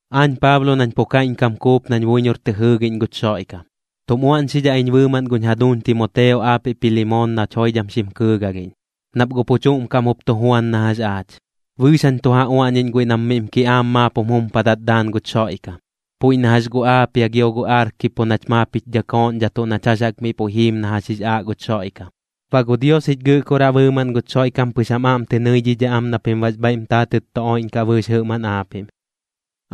Aañ Paablo nañ pu kaiꞌñkam kuup nañ buiñor tɨ jɨɨgiꞌñ guch Xoiꞌkam, tum uaꞌñxidhaꞌ iñ bɨɨmaꞌn guñ jaduuñ Timoteo aapiꞌ Pilimoon nach joidham xim kɨɨgalhiꞌñ, nap guꞌ pu chuꞌm kaꞌm jup tu juan na jax aach. Bɨɨx jañ tu ja uaꞌñiꞌñ guiꞌ nam miꞌm kiꞌaam maap jum jumpadat daan guch Xoiꞌkam, puiꞌ na jax gu Aapia gio gu Arkiipo nach maap jich dhakooꞌñdhatuꞌ nach jax jaꞌk miꞌ puiꞌ jiim na jax jix aaꞌ guch Xoiꞌkam. Baꞌ gu Dios jich Gɨꞌkoraꞌ bɨɨmaꞌn guch Xoiꞌkam pɨx jam aꞌm tɨ nɨidhidhaꞌ am na pim baꞌx bhaiꞌm taatɨt tu oiꞌñkaꞌ bɨɨx jɨꞌmaꞌn aapiꞌm.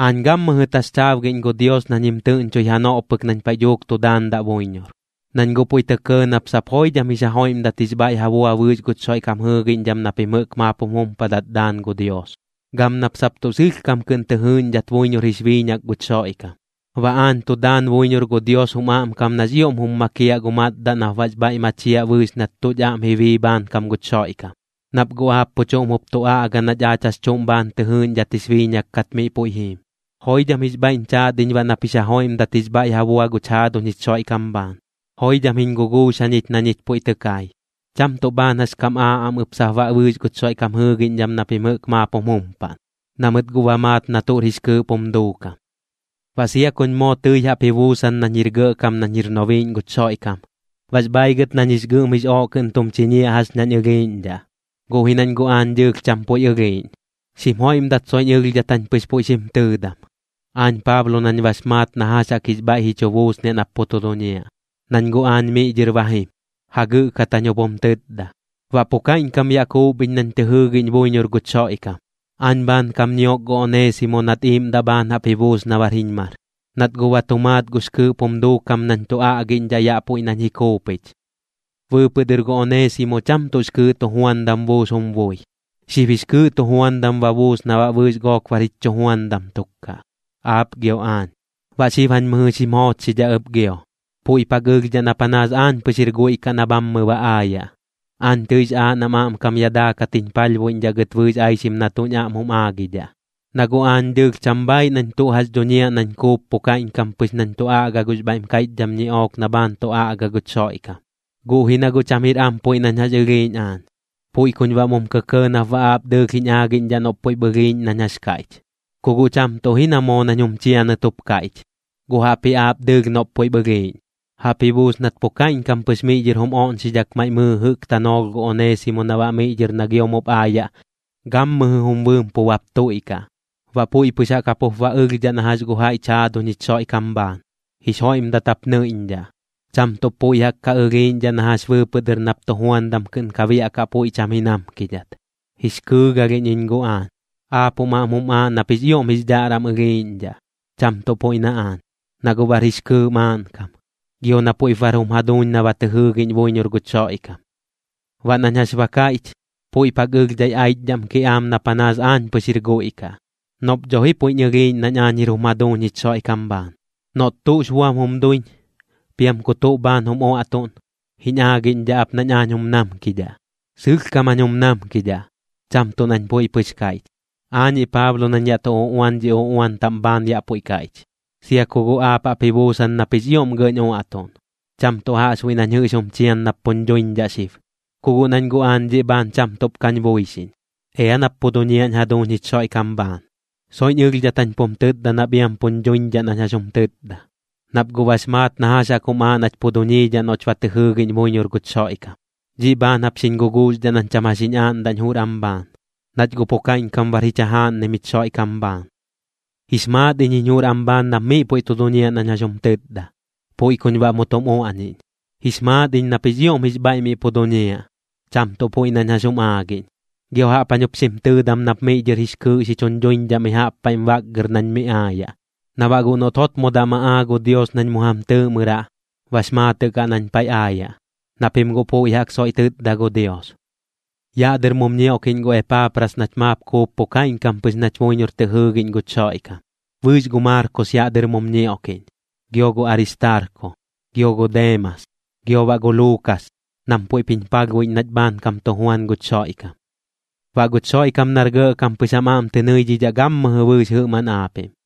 Aañ gammɨjɨ taxchaabgiꞌñ gu Dios nañ jim tɨꞌñchoi janoꞌ pɨk nañ paiꞌ dhuuk tu daandaꞌ buiñor, nañ guꞌ puiꞌ tɇ kɇɇ nap sap joidham jix ja joiꞌmdat jix bhaiꞌ ja bua bɨɨx guch Xoiꞌkam jɨɨgiꞌñdham na pim jɨꞌk maap jum jumpadat daan gu Dios, gam nap sap tuꞌ sɨlhkam kɨꞌn tɨ jɨɨꞌñdhat buiñor jix biiñak guch Xoiꞌkam. Baꞌ aañ tu daan buiñor gu Dios jum aꞌmkam nax ioꞌm jum makiaꞌ gu matdaꞌ nap baꞌx bhaiꞌ machiaꞌ bɨɨx nat tuꞌch aꞌm ji bii bhaankam guch Xoiꞌkam, nap guꞌ aap pu chuꞌm jup tu aꞌga nach aach jax chuꞌm bhaan tɨ jɨɨꞌñdhat jix biiñak kat miꞌ puiꞌ jiim. Joidham jix bhaiꞌñ chaat iñ baꞌ nap jix ja joiꞌmdat jix bhaiꞌ ja bua guch jaaduñ jich Xoiꞌkam bhaan, joidham jiñ guguux jañich na ñich puiꞌ tɨ kai. Cham tuꞌ bhaan jax kam aaꞌ am ɨp sap baꞌ bɨɨx guch Xoiꞌkam jɨɨgiꞌñdham na pim jɨꞌk maap jum jumpaꞌn, na mɨt guꞌ ba maat na tuꞌr jix kɨɨꞌp jum duukam. Baꞌ sia kuñ moo tɨi jaꞌp ji buusan nañ jir gɇꞌkam nañ jir nobiiꞌñ guch Xoiꞌkam, baꞌx bhaaigɨt nañ jix gɨꞌm jix ooꞌ kɨꞌn tum chiñiaꞌ jax ñañ ɨlhiiꞌñdhaꞌ, guꞌ ji nañ guꞌ aañ dɨɨlh cham puiꞌ ɨlhiiꞌñ. Xim joiꞌmdat soiꞌñ ɨlhdhat jañ pɨx puiꞌ xim tɨɨdam, aañ Paablo nañ bax maat na jax jaꞌk jix bhaiꞌ ji chu buusniaꞌ nap pu tu duñiaꞌ, nañ guꞌ aañ miꞌ dhɨr ba jim, jagɨꞌkat jañ jup jum tɨtda. Baꞌ pu kaiꞌñkam yaꞌ kuup iñ nañ tɨ jɨɨgiꞌñ buiñor guch Xoiꞌkam. Aañ bhaankam ñiok gu Oneesimo nat iiꞌmdaꞌ bhaan jaꞌp ji buus na bar jiñ mar, nat guꞌ ba tu maat gux kɨɨꞌp jum duukam nañ tu aꞌgiꞌñdhaꞌ yaꞌ puiꞌ nañ ji kuupich. Bɨɨpɨꞌ dɨr gu Oneesimo cham tuꞌx kɨɨꞌ tujuandam buus jum bui. Xib jix kɨɨꞌ tujuandam ba buus na baꞌ bɨɨx gook bar jich chujuandam tuk kaꞌ, aap gio aañ. Baꞌ xib jañ mɨjɨ xim joochxidhaꞌ ɨp gio, puiꞌp jaꞌk ɨlhdhaꞌ na panaas aañ pɨx jir guiꞌ kaꞌ na bhammɨ ba aayaꞌ. Aañ tɨix aaꞌ nam aꞌmkam yaꞌ daakat jiñ palhbuiꞌñdhaꞌ gɨt bɨɨx aixim na tuꞌñ aꞌm jum aagidhaꞌ, na guꞌ aañ dɨɨlh cham bhaaiꞌ nañ tuꞌ jax duñiaꞌ nañ kuup pu kaiꞌñkam pɨx nañ tu aꞌga gux bhaiꞌm kaiꞌchdham ñiꞌook na bhaan tu aꞌga guch Xoiꞌkam. Guꞌ ji na guꞌ cham jir am puiꞌ nañ jax ɨlhiiꞌñ aañ, puiꞌ kuñ baꞌ mum kɇkɇɇ nap baꞌ aap dɨɨlh jiñ aagiꞌñdhaꞌ noꞌp puiꞌp ɨlhiiꞌñ nañ jax kaiꞌch. Ku guꞌ cham tuꞌ ji na moo nañ jum chianɨt jup kaiꞌch, guꞌ jaꞌpji aap dɨɨlh noꞌp puiꞌp ɨlhiiꞌñ. Jaꞌp ji buus nat pu kaiꞌñkam pɨx miꞌ dhɨr jum oꞌñxidhak maiꞌ mɨɨ jɨꞌk tanoolh gu Oneesimo na baꞌ miꞌ dhɨr na gio mup aayaꞌ, gammɨjɨ jum bɨɨm pu bap tuiꞌkaꞌ. Baꞌ puiꞌ pɨx jaꞌk jap jup ba ɨlhdhaꞌ na jax gu jaiꞌch jaaduñ jich Xoiꞌkam bhaan. Jix joiꞌmdat jap nɨiꞌñdhaꞌ, cham tuꞌp puiꞌ jaꞌk ka ɨlhiiꞌñdhaꞌ na jax bɨɨpɨꞌ dɨr nap tujuandam kɨꞌn ka biaꞌkaꞌ puiꞌ cham ji namkidhat. Jix kɨɨgalhiꞌñ iñ guꞌ aañ. Aap jum aꞌm jum aaꞌ nap jix ioꞌm jix dhaꞌram ɨlhiiꞌñdhaꞌ, cham tuꞌ puiꞌ na aañ, na guꞌ bar jix kɨɨꞌ maaꞌnkam, gio na puiꞌp bar jum jaduuñ na ba tɨ jɨɨgiꞌñ buiñor guch Xoiꞌkam. Baꞌ nañ jax ba kaiꞌch, puiꞌp jaꞌk ɨlhdhai aichdhaꞌm kiꞌaam na panaas aañ pɨx jir guiꞌ kaꞌ, noꞌp dho ji puiꞌñ ɨlhiiꞌñ nañ aañ jir jum jaduuñ jich Xoiꞌkam bhaan. Noꞌt tuꞌx buam jum duiñ, piam ku tuꞌ bhaan jum uaꞌtuꞌn, jiñ aagiꞌñdhaꞌ ap nañ aañ jum namkidhaꞌ. Sɨlhkam jañ jum namkidhaꞌ, cham tuꞌ nañ puiꞌ pɨx kaiꞌch. Aañiꞌ Paablo nañ yaꞌ tu uꞌuan dhi uꞌuan taꞌm bhaan yaꞌ puiꞌ kaiꞌch. Sia ku guꞌ aap jaꞌp ji buusan nap jix ioꞌm gɇꞌñ uaꞌtuꞌn, cham tuꞌ jaꞌxbuiꞌ nañ jɨꞌx jum chian nap puñ dhuiñdhaꞌ xib, ku guꞌ nañ guꞌ aañ dhiꞌ bhaan cham tuꞌp kañ buixiꞌñ. Ea nap pu duñiaꞌñ jaduuñ jich Xoiꞌkam bhaan. Soiꞌñ ɨlhdhat jañ pum tɨtda nap iam puñ dhuiñdhaꞌ nañ jax jum tɨtda, nap guꞌ bax maat na jax jaꞌk jum aaꞌ nach pu duñiidhaꞌ noꞌch ba tɨ jɨɨgiꞌñ buiñor guch Xoiꞌkam. Dhiꞌ bhaan jap xiñ guguuxdhaꞌ nañ cham jax jiñ aaꞌndaꞌñ jur am bhaan, nach guꞌ pu kaiꞌñkam bar jich jajaaꞌnnim jich Xoiꞌkam bhaan. Jix maat iñ jiñ jur am bhaan nap miꞌ puiꞌ tu duñiaꞌ nañ jax jum tɨtda, puiꞌ kuñ baꞌ mu tum uaꞌñiꞌñ. Jix maat iñ nap jix ioꞌm jix bhaiꞌ miꞌ pu duñiaꞌ, cham tuꞌ puiꞌ nañ jax jum aagiꞌñ. Gio jaꞌp jañ jup xim tɨɨdam nap miꞌ dhɨr jix kɨɨꞌ xi chuñ dhuiñdhaꞌ mi jaꞌp paiꞌm baꞌgɨr nañ mi aayaꞌ, na baꞌ guꞌ noꞌt jotmodaꞌ ma aa gu Dios nañ mu jam tɨɨꞌmɨraꞌ, bax maatɨꞌ kaꞌ nañ paiꞌ aayaꞌ, na pim guꞌ puiꞌ jaꞌk soiꞌ tɨtda gu Dios. Yaꞌ dɨr mum ñioꞌkiꞌñ gu Epaapras nach maap kuup pu kaiꞌñkam pɨx nach buiñor tɨ jɨɨgiꞌñ guch Xoiꞌkam. Bɨɨx gu Maarkos yaꞌ dɨr mum ñioꞌkiꞌñ, gio gu Aristaarko, gio gu Deemas, gio baꞌ gu Luukas, nam puiꞌp jiñ palhbuiꞌñ nach bhaankam tu juan guch Xoiꞌkam. Baꞌ guch Xoiꞌkam nar gɇꞌkam pɨx jam aꞌm tɨ nɨidhidhaꞌ gammɨjɨ bɨɨx jɨꞌmaꞌn aapiꞌm.